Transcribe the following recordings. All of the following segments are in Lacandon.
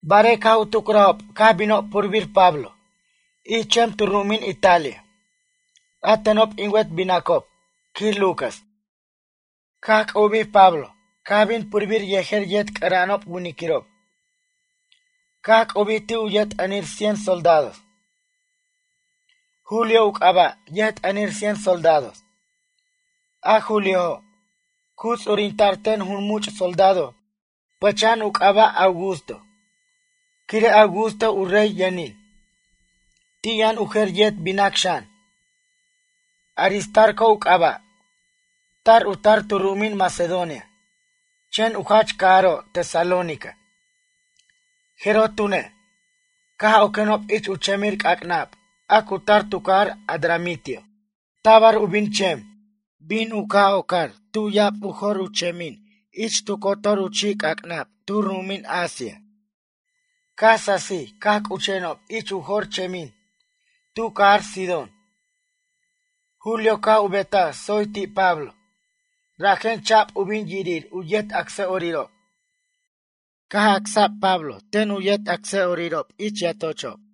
Barej caj u tucrajob caj binob purbir Pablo ich chem tu ru'umin Italia, a tenob in wet binacob, quij Lucas. Caj c'ubij Pablo caj bin purbir yejer yet c'ʌra'anob winiquirob caj c'ubij ti' u yʌjt'ʌnir cien soldados. Julio u c'aba' yʌjt'ʌnir cien soldados. A Juliojo', cu ts'urinta'r ten jun much' soldado pʌcha'an u c'aba' Augusto, quire' Augusto u rey yʌnin. Ti' yʌn u jer yet binac xan, Aristarco u c'aba'. Tar u tar tu ru'umin Macedonia, chen u jach cajaro' Tesalónica. Jeroj tune', caj oquenob ich u chemir c'ac'nab a cu tar tu cajar Adramitio. Tabar u bin chem, bin u ca' ocar tu ya'ab u jor u chemin ich tu cotor u chi'c'ac'nab tu ru'umin Asia. Caj sasij caj c'uchenob ich u jor u chemin tu cajar Sidón. Julio caj u betaj tsoy ti' Pablo, rajen cha'b u bin yirir u yet acsa'orirob. Caj acsa'b Pablo ten u yet acsa'orirob ich yatochob.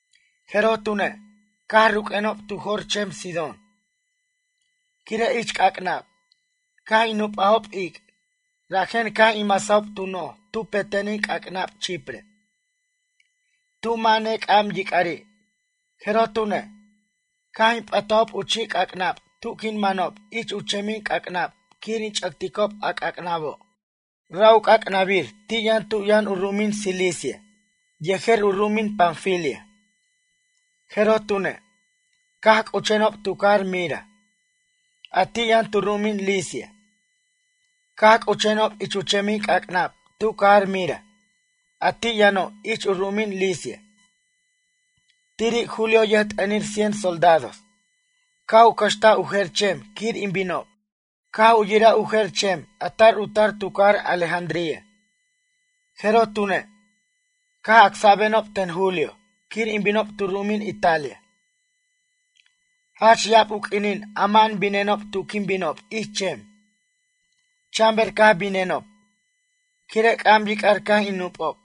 Jeroj tune', caj ruq'uenob tu jor chem Sidón. Quire' ich c'ac'nab, caj in nupajob ic', rajen caj in masajob tu noj tu petenin c'ac'nab Chipre, tu mʌ' nec'am yic'ari'. Jeroj tune', caj in p'ʌtajob u chi' c'ac'nab tu quin manob ich u chemic'ac'nab quir in ch'ʌcticob a c'ac'nabo'. Ra' u c'ac'nabir ti' yʌn tu yʌn u ru'umin Cilicia yejer u ru'umin Panfilia. Jeroj tune', caj c'uchenob tu cajar Mira, a ti' yʌn tu ru'umin Licia. Caj c'uchenob ich u chemin c'ac'nab tu cajar Mira a ti' yʌno' ich u ru'umin Licia. Tiri' Julio yʌjt'ʌnir cien soldados caj u cʌxtaj u jer chem quir in binob. Caj u yiraj u jer chem a tar u tar tu cajar Alejandría. Jeroj tune', caj acsa'benob ten Julio quir in binob tu ru'umin Italia. Jach ya'ab u q'uinin ama'an binenob tu quin binob ich chem. Chan ber caj binenob, quire' c'am yic'ar caj in nupob.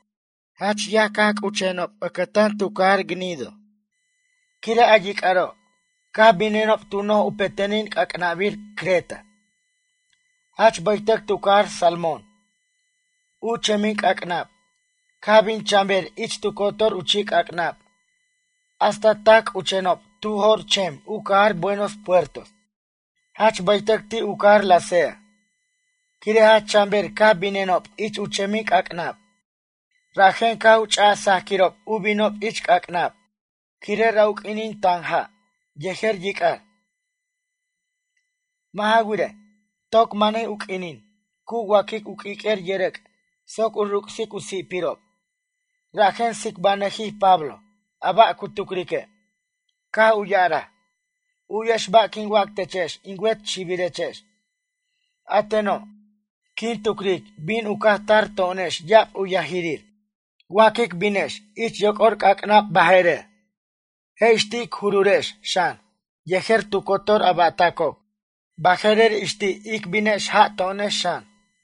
Jach yaj caj c'uchenob ʌcʌtan tu cajar Gnido, quire' a yic'aro'. Caj binenob tu noj u petenin c'ac'nabir Creta, jach baytʌc tu cajar Salmón. U chemin c'ac'nab, caj bin chan ber ich tu cotor u chi'c'ac'nab hasta tac c'uchenob tu jor chem u cajar Buenos Puertos, jach baytʌc ti' u cajar Lasea. Quire' jach chan ber caj binenob ich u chemin c'ac'nab. Rajen caj u ch'aj sajquirob u binob ich c'ac'nab, quire' ra' u q'uinin tan ja' yejer yic'ar. Mʌ' ja wirej, toc manij u q'uinin cu wa'quic u q'uiq'uer yʌrʌc' soc u ruc'sic u si'pirob. Rajen tsibanʌjij Pablo a ba' cu tucrique'. Caj u ya'araj: ―U'yex ba' quin wac techex in wet xibirechex. A teno', quin tucric bin u caj tar to'onex ya'ab u yajirir, wa quic binex ich yoc'or c'ac'nab baje'rer. Je' ix ti' ic jururex xan yejer tu cotor u ba'tacob. Baje'rer ix ti' ic binex ja' to'onex xan.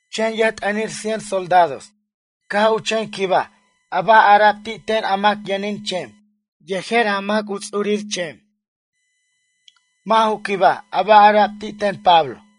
Chen yʌjt'ʌnir cien soldados caj u chen quibaj a ba' ara'b ti' ten a mac yʌnin chem yejer a mac a cu ts'ur chem, mʌ' ju quibaj a ba' ara'b ti' ten Pablo.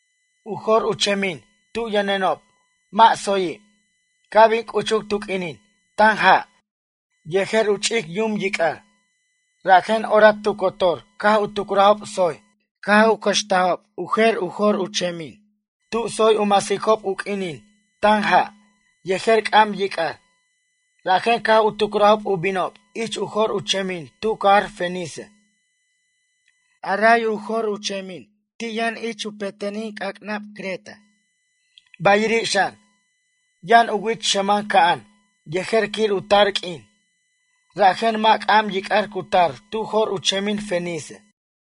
U jor u chemin tu yʌnenob mʌ' tsoyi', ca' bin c'uchuc tu q'uinin tan ja' yejer u ch'ic yum yic'ar, rajen orac tu cotor caj u tucrajob tsoy caj cʌxtajob u jer u jor u chemin tu tsoy u masicob u q'uinin tan ja' yejer c'am yic'ar. Rajen caj u tucrajob u binob ich u jor u chemin tu cajar Fenice. A ray u jor u chemin ti' yʌn ich u petenin c'ac'nab Creta. Bayiri' xan, yʌn u wich xʌman ca'an yejer quir u tar q'uin, rajen mʌ' c'am yic'ar cu tar tu jor u chemin Fenice.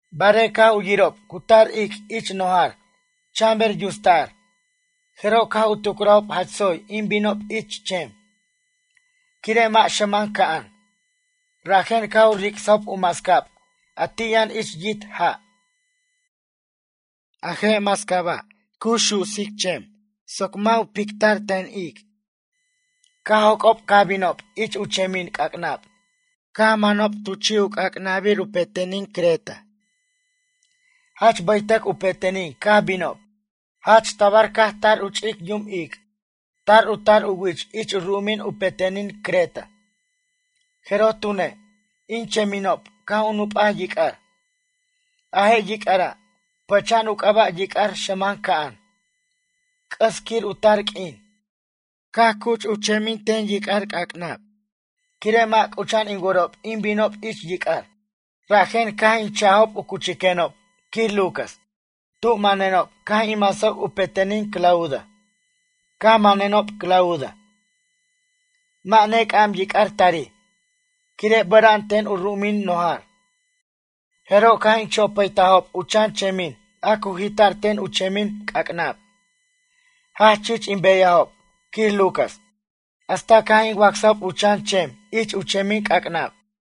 Barej caj u yirob cu tar ic' ich nojar chan ber yusta'r, jeroj caj u tucrajob jach tsoy in binob ich chem, quire' mʌ' xʌman ca'an. Rajen caj u ric'sajob u mascab a ti' yʌn ich yit' ja'. A je' mascaba', cu su'sic chem soc mʌ' u picta'r ten ic'. Caj joc'ob caj binob ich u chemin c'ac'nab caj u manob tu chi' u c'acnabir u petenin Creta. Jach bʌytʌc u petenin caj binob. Jach tabar caj tar u ch'ic yum ic'. Tar u tar u wich ich u ru'umin u petenin Creta. Jeroj tune' in cheminob caj u nup'aj yic'ar. A je' yic'ara', pʌcha'an u c'aba' Yic'ar Xʌman Ca'an, c'ʌs quir u tar q'uin. Caj cuch u chemin c'ac'nab ten yic'ar, quire' mʌ' c'ucha'an in worob in binob ich yic'ar, rajen caj in cha'ajob u cuchiquenob, quij Lucas. Tu manenob caj in masajob u petenin Clauda. Caj manenob Clauda, mʌ' ne c'am yic'ar tarij, quire' bʌra'an ten u ru'umin, nojar. Jeroj caj in chopʌtajob u chan chemin a cu jita'r ten u chemin c'ac'nab. Jach chich ic beyajob, quij Lucas, hasta caj in wacsajob u chan chem ich u chemin c'ac'nab.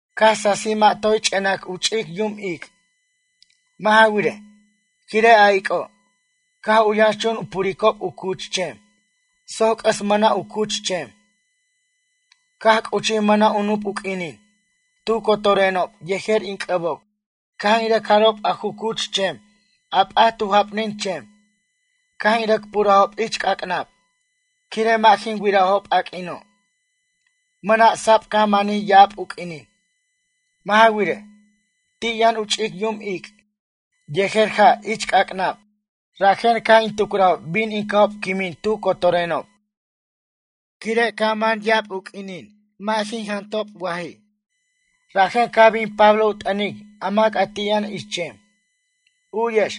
Caj sasij mʌ' toy ch'enac u ch'ic yum ic'. Mʌ' ja wirej, quire' a ic'o', caj u yʌnchun u puricob u cuch chem soc c'ʌs mʌna' u cuch chem. Caj c'uchij mʌna' u nup u q'uinin, tu cotorenob yejer in c'ʌbob caj in rʌc jarob a ju cuch chem a p'at tu japnin chem, caj in rʌc purajob ich c'ac'nab. Quire' mʌ' jin wirajob a q'uino', mʌna' sab caj manij ya'ab u q'uinin. Mʌ' ja wirej, ti' yʌn u ch'ic yum ic' yejer ja' ich c'ac'nab, rajen caj in tucrajob bin in ca'ob quimin tu cotorenob. Quire' caj man ya'ab u q'uinin mʌ' jin jantajobi' waj, rajen caj bin Pablo u t'ʌnic a mac a ti' yʌn ich chem: ―U'yex,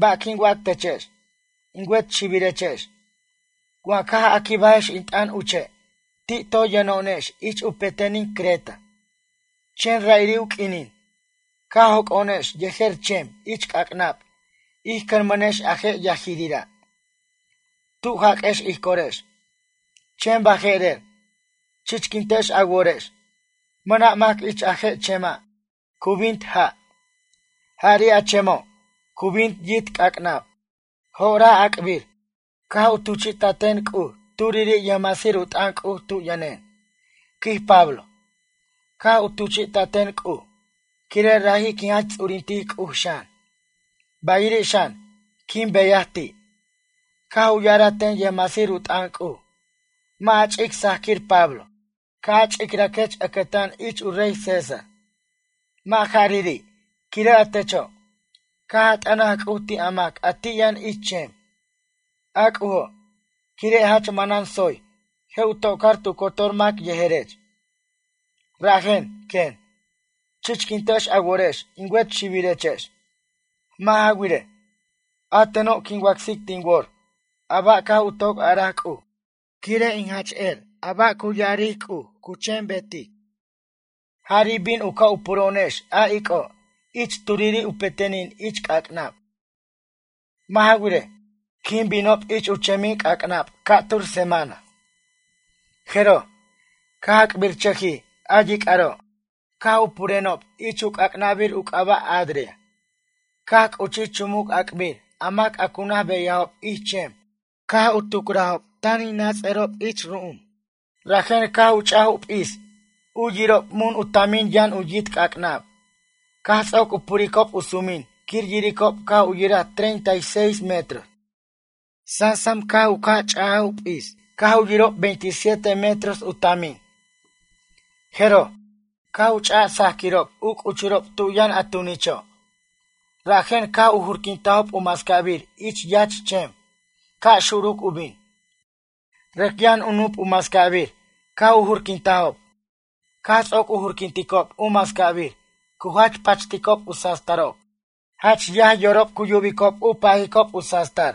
ba' quin wac techex, in wet xibirechex. Wa caj a quibajex in t'ʌn uche' ti' toy yʌno'onex ich u petenin Creta. Chen ra'iri' u q'uinin, caj joco'onex yejer chem ich c'ac'nab ij cʌnmʌnex a je' yajirira' tu jaq'uex ij corex. Chen baje'rer, chichquintex a worex, mʌna' mac ich a je' chema' cu bint ja'. Jari' a chemo', cu bint yit' c'ac'nab. Jo'oraj ac'bir, caj u tuchi'taten C'uj turiri' yʌjmasir u t'ʌn C'uj tu yʌnen, ―quij Pablo―. Caj u tuchi'taten C'uj, quire' raji' quin jach ts'urintic C'uj xan, bayiri' xan, quin beyaj ti'. Caj u ya'araj ten yʌjmasir u t'ʌn C'uj: “Mʌ' a ch'ic sajquir Pablo. Ca' a ch'icraquech ʌcʌtan ich u rey César. Mʌ' jarari', quire' a techo', caj a t'ʌnaj C'uj ti' a mac a ti' yʌn ich chem, a C'ujo', quire' jach manan tsoy je' u tocar tu cotor mac yejerech.” Rajen, quen, chichquintex a worex in wet xibirechex, mʌ' ja wirej, a teno' quin wacsic tin wor a ba' caj u toc araj C'uj, quire' in jach wer a ba' cu ya'aric C'uj cu chen betic. Jari' bin u ca' u puro'onex a ic'o' ich turiri' u petenin ich c'ac'nab. Mʌ' ja wirej, quin binob ich u chemin c'ac'nab ca'tur semana. Jeroj, caj ac'birchʌjij a yic'aro' caj u purenob ich u c'ac'nabir u c'aba' Adria. Caj c'uchij chumuc ac'bir a mac a cu naj beyajob ich chem caj tucrajob tan in nats'arob ich ru'um. Rajen caj u ch'aj u p'is u yirob mun u tamin yʌn u yit' c'ac'nab. Caj ts'oc u puricob u sumin quir yiricob caj u yiraj treinta y seis metros. Sasam caj u ca' ch'u p'is caj u yirob veintisiete metros u tamin. Jeroj, caj u ch'aj sajquirob u c'uchurob tu yʌn a tunicho', rajen caj u jurquintajob u mascabir ich yach chem ca' xuruc u bin. Rʌc yʌn u nup u mascabir caj u jurquintajob. Caj ts'oc u jurquinticob u mascabir cu jach pachticob u sastarob. Jach yaj yorob cu yubicob u pajicob u sastar.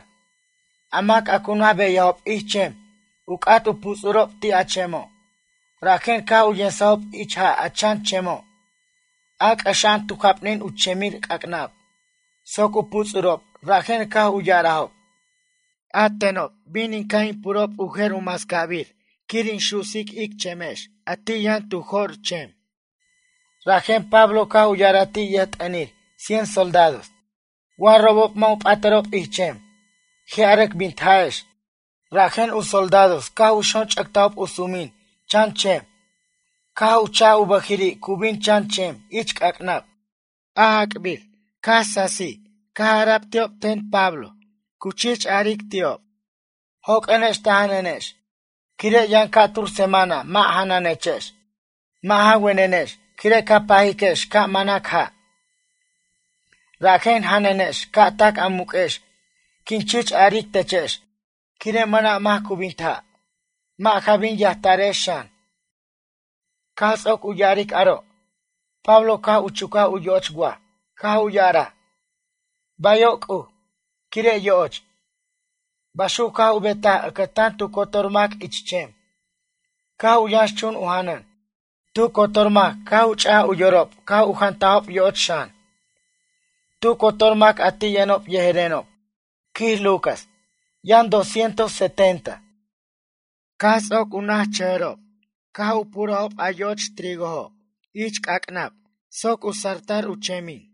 A mac a cu naj beyajob ich chem u c'at u puts'urob ti' a chemo', rajen caj u yemsajob ich ja' a chan chemo', a c'ʌxa'an tu japnin u chemir c'ac'nab, soc u puts'urob rajen caj u ya'arajob: ―Atenob, bin in ca' in purob u jer u mascabir quir u su'sic ic chemex a ti' yʌn tu jor chem. Rajen Pablo caj u ya'araj ti' yʌjt'ʌnir cien soldados: ―Wa robob mʌ' u p'atʌrob ich chem, je' a rʌc bint ja'ex. Rajen u soldados caj u xonch'ʌctajob u sumin chan chem, caj u chaj u bʌjiri' cu bin chan chem ich c'ac'nab. Ac'ab caj sasij caj ara'b ti'ob ten Pablo cu chich aric ti'ob: ―Joq'uenex ta janʌnex quire' yʌn ca'tur semana mʌ' janʌnechex mʌ' ja wenenex quire' ca pajiquex ca' manac ja'. Rajen janʌnex ca' tac a muq'uex quin chich aric techex quire' mʌna' mac cu bint ja'. Mʌ' ja bin yajtarex xan. Caj ts'oc u ya'aric aro', Pablo caj u chucaj u yo'och waj caj u ya'araj: “Bayo' C'uj”, quire' yo'och. Baxuc caj u betaj ʌcʌtan tu cotor mac ich chem, caj u yʌnxchun u janʌn. Tu cotor mac caj u ch'aj u yorob caj u jantajob yo'och xan. Tu cotor mac a ti' yʌnob yejerenob, quij Lucas, yʌn doscientos setenta. Caj ts'oc u nachʌjʌrenob caj u purajob a yo'och trigojo' ich c'ac'nab soc satar u chemin.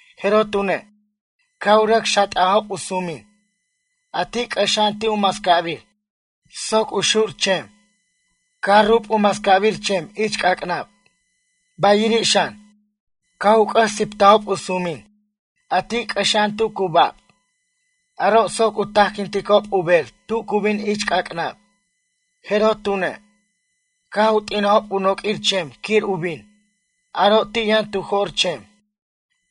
Jeroj tune', caj u rʌc xat'ajob u sumin, a ti' c'ʌxa'an ti' u mascabir soc u xur chem. Caj rub u mascabir chem ich c'ac'nab. Bayiri' xan, caj u c'ʌs siptajob u sumin, a ti' c'ʌxa'an tu cu bab, aro' soc u tajquinticob u ber tu cu bin ich c'ac'nab. Jeroj tune', caj u t'inajob u noquir chem quir u bin, aro' ti' yʌn tu jor chem.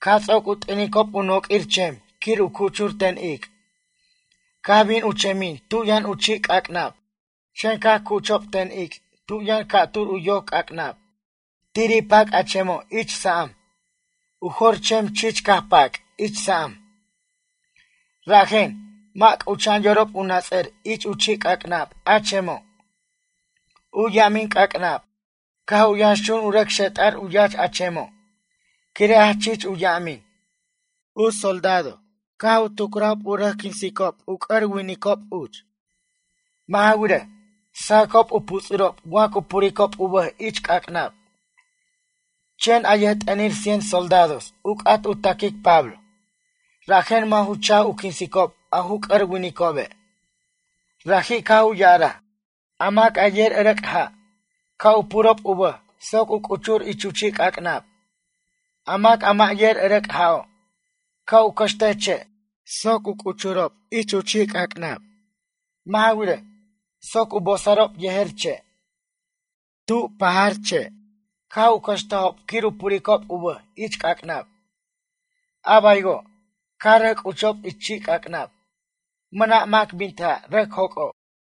Caj ts'oc u t'inicob u noq'uir chem quir u cuchur ten ic', caj bin u chemin tu yʌn u chi' c'ac'nab. Chen caj cuchob ten ic' tu yʌn ca'tur u yoc c'ac'nab, tiri' pac' a chemo' ich sa'am. U jor chem chich caj pac' ich sa'am. Rajen, mʌ' c'ucha'an yorob u nats'ar ich chi' c'ac'nab a chemo'. U yamin c'ac'nab, caj u yʌnxchun u rʌc xet'ar u yach a chemo', quire' jach chich u yamin. U soldado, caj u tucrajob u rʌc quinsicob u c'ʌr winiquirob uch. Mʌ' ja wirej, sajʌcob u puts'urob wa cu puricob u bʌj ich c'ac'nab. Chen a yʌjt'ʌnir cien soldados u c'at u taquic Pablo, rajen mʌ' ju cha'j u quinsicob a ju c'ʌr winicobe'. Raji' caj u ya'araj: ―A mac a yer ʌrʌc' ja', ca' u purob u bʌj soc u c'uchur ich u chi' c'ac'nab. A mac a mʌ' yer ʌrʌc' ja'o', ca' u cʌxtej che' soc u c'uchob ich u chi' c'ac'nab. Mʌ' ja wirej, soc u bosarob yejer che'. Tu pajar che', caj u cʌxtajob quir u puricob u bʌj ich c'ac'nab. A baywo', caj rʌc c'uchob ich chi' c'ac'nab, mʌna' mac bint ja' rʌc joc'ob.